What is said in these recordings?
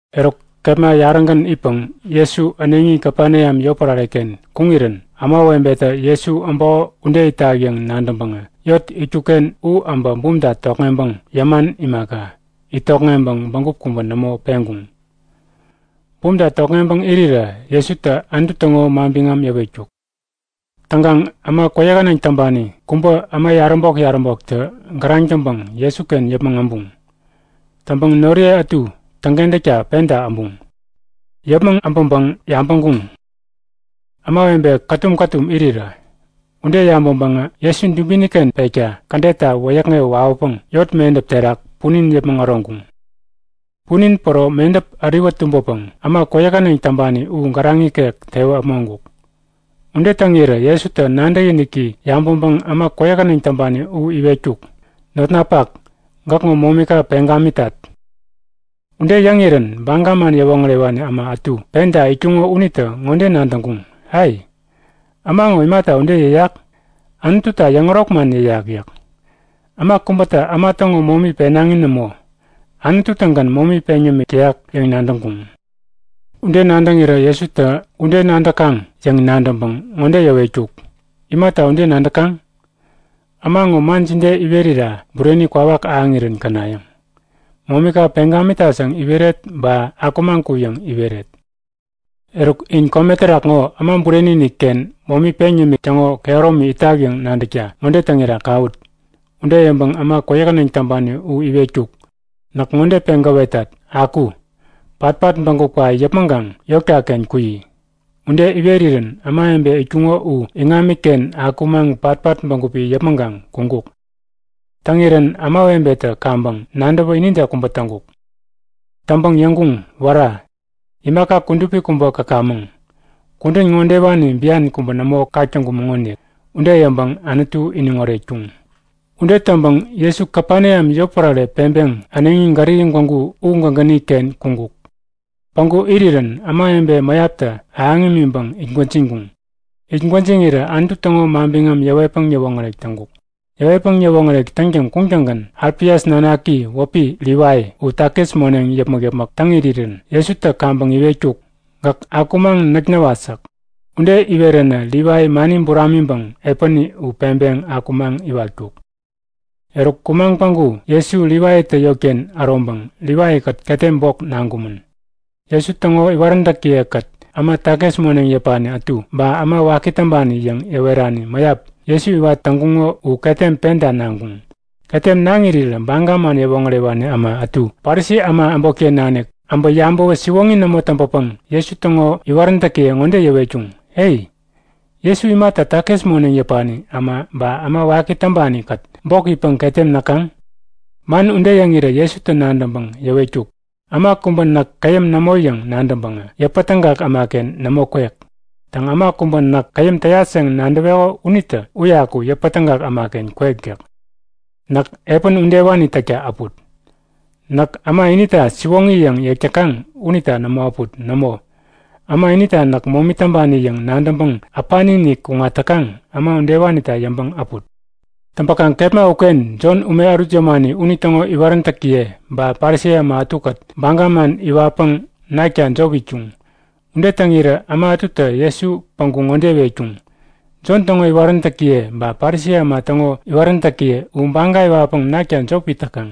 Eruk kepma yarägän itpäŋ Jesu äneŋi Kapeneam yotpärare-ken kuŋirän ämawebetä Jesu äbäko ude itak yäŋ nadäŋpäŋä yot itkuk-ken u äbä bumta tokŋeŋpäŋ yäman imaka, it tokŋeŋpäŋ bägup kubä nämo peŋkuŋ. Bumta tokŋeŋpäŋ irirä Jesutä Anutu täŋo manbiŋam yäwetkuk. Täŋkaŋ äma kwäyähäneŋ täŋpani kubä äma yaräbok-yaräboktä gäraŋ täŋpäŋ Jesuken yäpmäŋ äbuŋ. Täŋpäŋ noriye ätu täŋkentäkta penta äbuŋ. Yäpmäŋ äbäŋpäŋ yabäŋkuŋ; Ämawebe kätum-kätum irirä. Ude yabäŋpäŋä Jesu dubini-ken pekta kädetta wäyäkŋewä wawäpäŋ yot medäp terak punin yäpmäŋ äroŋkuŋ. Punin päro medäp äriwä tumbäpäŋ äma kwäyähäneŋ täŋpani u gäraŋ ikek tewä äpmoŋkuk. Ude täŋirä Jesutä nadäkiniki yabäŋpäŋ äma kwäyähäneŋ täŋpani u iwetkuk; Notnapak, gäkŋo momika peŋ gamitat! Ude yäŋirän Baga man yäwoŋärewani äma ätu penta itkuŋo unitä ŋode nadäŋkuŋ; Ai, äma ŋo imata ude yäyak? Anututa yäŋärok man yäyak yäk. Äma kubätä äma täŋo momi penaŋi nämo. Anutu-tägän momi peŋ yämik täyak yäŋ nadäŋkuŋ. Ude nadäŋirä Jesutä Ude nadäkaŋ yäŋ nadäŋpäŋ ŋode yäwetkuk; Imata ude nadäkaŋ? Äma ŋo man jide iwerira bureni kwawak ahäŋirän känayäŋ?; Momika peŋ gamitat yäŋ iweret ba Akumaŋ ku yäŋ iweret? Eruk, in kome terak ŋo Äma Bureni-inik-ken momi peŋ yämik täŋo kehäromi itak yäŋ nadäkta ŋode täŋira kawut. Ude yäŋpäŋ äma kwäyähäneŋ täŋpani u iwetkuk; Näk ŋode peŋ gäwetat; Aku! Patpat bägupka yäpmäŋkaŋ yotka-ken kuyi! Ude iwerirän ämawebe itkuŋo u iŋamiken akumaŋ patpat bägupi yäpmäŋkaŋ kuŋkuk. Täŋirän ämawebetä kaŋpäŋ nadäwä inide kubä täŋkuk. Täŋpäŋ yäŋkuŋ; Wära! Imaka kudupi kubä käkamäŋ! Kudän ŋodewani bian kubä nämo kak täŋkumäŋonik. Ude yäŋpäŋ Anutu iniŋ oretkuŋ. Ude täŋpäŋ Jesu Kapeneam yotpärare peŋpeŋ äneŋi Galili gwägu u gägäni-ken kuŋkuk. Päŋku irirän ämawebe mäyaptä ahäŋ imiŋpäŋ it gwäjiŋkuŋ. It gwäjiŋirä Anutu täŋo manbiŋam yäwetpäŋ yäwoŋärek täŋkuk. Yäwetpäŋ yäwoŋärek täŋtäŋ kuŋattäŋgän Alfias nanaki wäpi Livai u takis moneŋ yäpmäk-yäpmäk täŋ irirän Jesutä kaŋpäŋ iwetkuk; Gäk akumaŋ näk näwat yäk. Ude iweränä Livai mani buramiŋpäŋ epäni u peŋpeŋ akumaŋ iwatkuk. Eruk kumaŋ päŋku Jesu Livaitä yotken äroŋpäŋ Livaikät ketem bok naŋkumän. Jesu täŋo iwaräntäkiye-kät äma takis moneŋ yäpani ätu ba äma waki täŋpani yäŋ yäwerani mäyap Jesu iwat täŋkuŋo u ketem penta naŋkuŋ. Ketem naŋ irirä Baga man yäwoŋärewani äma ätu Parisi äma äbotken nanik äbä yabäwä siwoŋi nämo täŋpäpäŋ Jesu täŋo iwaräntäkiye ŋode yäwetkuŋ; E! Jesu imata takis moneŋ yäpani äma ba äma waki täŋpani-kät bok itpäŋ ketem näkaŋ? Man ude yäŋirä Jesutä nadäŋpäŋ yäwetkuk; Äma kubä näk käyäm nämo yäŋ nadäŋpäŋä yäpätägak ämaken nämo kwek. Täŋ, äma kubä näk käyäm täyat yäŋ nadäweko unitä uyaku yäpätägak ämaken kwek yäk. Näk epän udewani täkta äput. Näk äma inita siwoŋi yäŋ yäk täkaŋ unita nämo äput. Nämo, äma inita näk momi täŋpani yäŋ nadäŋpäŋ äpani-inik kuŋat täkaŋ äma udewanita yäŋpäŋ äput. Täŋpäkaŋ kepma uken Jon ume ärut yämani unitäŋo iwaräntäkiye ba Parisi äma ätukät baga man iwatpäŋ nakta jop itkuŋ. Ude täŋirä äma ätutä Jesu päŋku ŋode iwetkuŋ; Jon täŋo iwaräntäkiye ba Parisi äma täŋo yäwaräntäkiye u baga iwatpäŋ nakta jop it täkaŋ.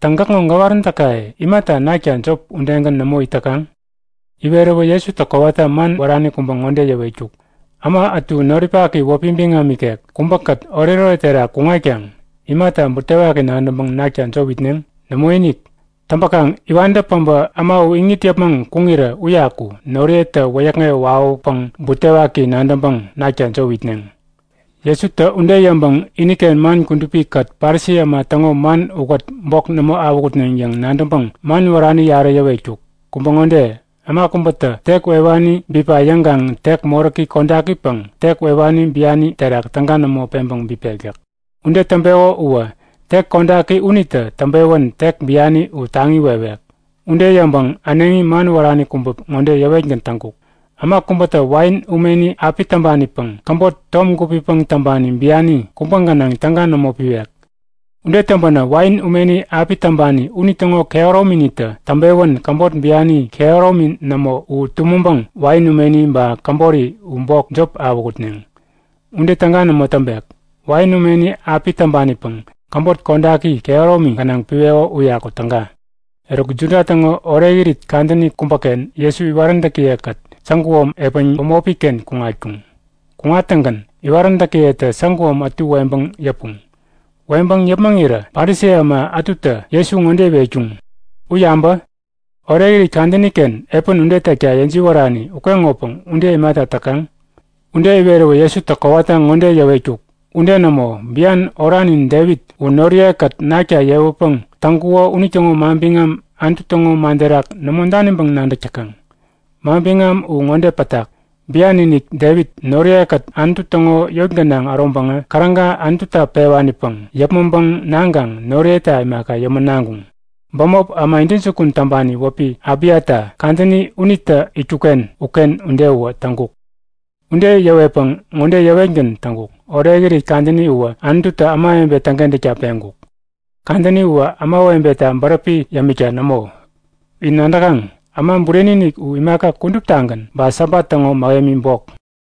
Täŋ, gäkŋo gäwaräntäkaye imata nakta jop udegän nämo it täkaŋ? Iweräwä Jesutä kowata man wärani kubä ŋode yäwetkuk; Äma ätu noripaki wäpi biŋam ikek kubäkät oretoret terak kuŋatkaŋ imata butewaki nadäŋpäŋ nakta jop itneŋ? Nämoinik! Täŋpäkaŋ iwantä päbä äma u iŋit yäpmäŋ kuŋirä uyaku noriyetä wäyäkŋewä wawäpäŋ butewaki nadäŋpäŋ nakta jop itneŋ. Jesutä ude yäŋpäŋ iniken man kudupi-kät Parisi äma täŋo man ukät bok nämo awähutneŋ yäŋ nadäŋpäŋ man wärani yarä yäwetkuk. Kubä ŋode; Äma kubätä tek wewani bipa yäŋkaŋ tek moräki kodakipäŋ tek wewani biani terak täga nämo peŋpäŋ bipek yäk. Ude täŋpeko uwä tek kodaki unitä täŋpewän tek biani u taŋi wewek. Ude yäŋpäŋ äneŋi man wärani kubä ŋode yäwetgän täŋkuk; Äma kubätä wain umeni api täŋpanipäŋ käbot tom gupipäŋ täŋpani biani kubä gänaŋ täga nämo piwek. Ude täŋpänä wain umeni api täŋpani unitäŋo kehärominitä täŋpewän käbot biani kehäromi nämo u tumäŋpäŋ wain umeni ba käbori u bok jop awähutneŋ. Ude täga nämo täŋpek. Wain umeni api täŋpanipäŋ käbot kodaki kehäromi gänaŋ piweko uyaku täga. Eruk Juda täŋo Orekirit kadäni kubäken Jesu iwaräntäkiye-kät säguom epän bämopi-ken kuŋatkuŋ. Kuŋattäŋgän iwaräntäkiyetä säguom ätu weŋpäŋ yäpuŋ. Weŋpäŋ yäpmäŋirä Parisi äma ätutä Jesu ŋode iwetkuŋ; U yabä! Orekirit kadäni-ken epän ude täkta yäjiwärani ukeŋopäŋ ude imata täkaŋ? Ude iweräwä Jesutä kowata ŋode yäwetkuk; Ude nämo! Bian oranin Devit u noriye-kät nakta yewäpäŋ täŋkuŋo unitäŋo manbiŋam Anutu täŋo man terak nämo daniŋpäŋ nadäk täkaŋ? Manbiŋam u ŋode pätak; Bian-inik Devit noriye-kät Anutu täŋo yot gänaŋ äroŋpäŋä käräga Anututa pewanipäŋ yäpmäŋpäŋ naŋkaŋ noriyeta imaka yämän naŋkuŋ. Bämop äma intäjukun täŋpani wäpi Abiata kadäni unitä itkuk-ken uken ude uwä täŋkuk. Ude yäwetpäŋ ŋode yäwetgän täŋkuk; Orekirit kadäni uwä Anututä ämawebe täŋkentäkta peŋkuk. Kadäni uwä ämawebeta bäräpi yämikta nämo. In nadäkaŋ? Äma Bureni-inik u imaka kuduptagän ba Sabat täŋo mähemi bok.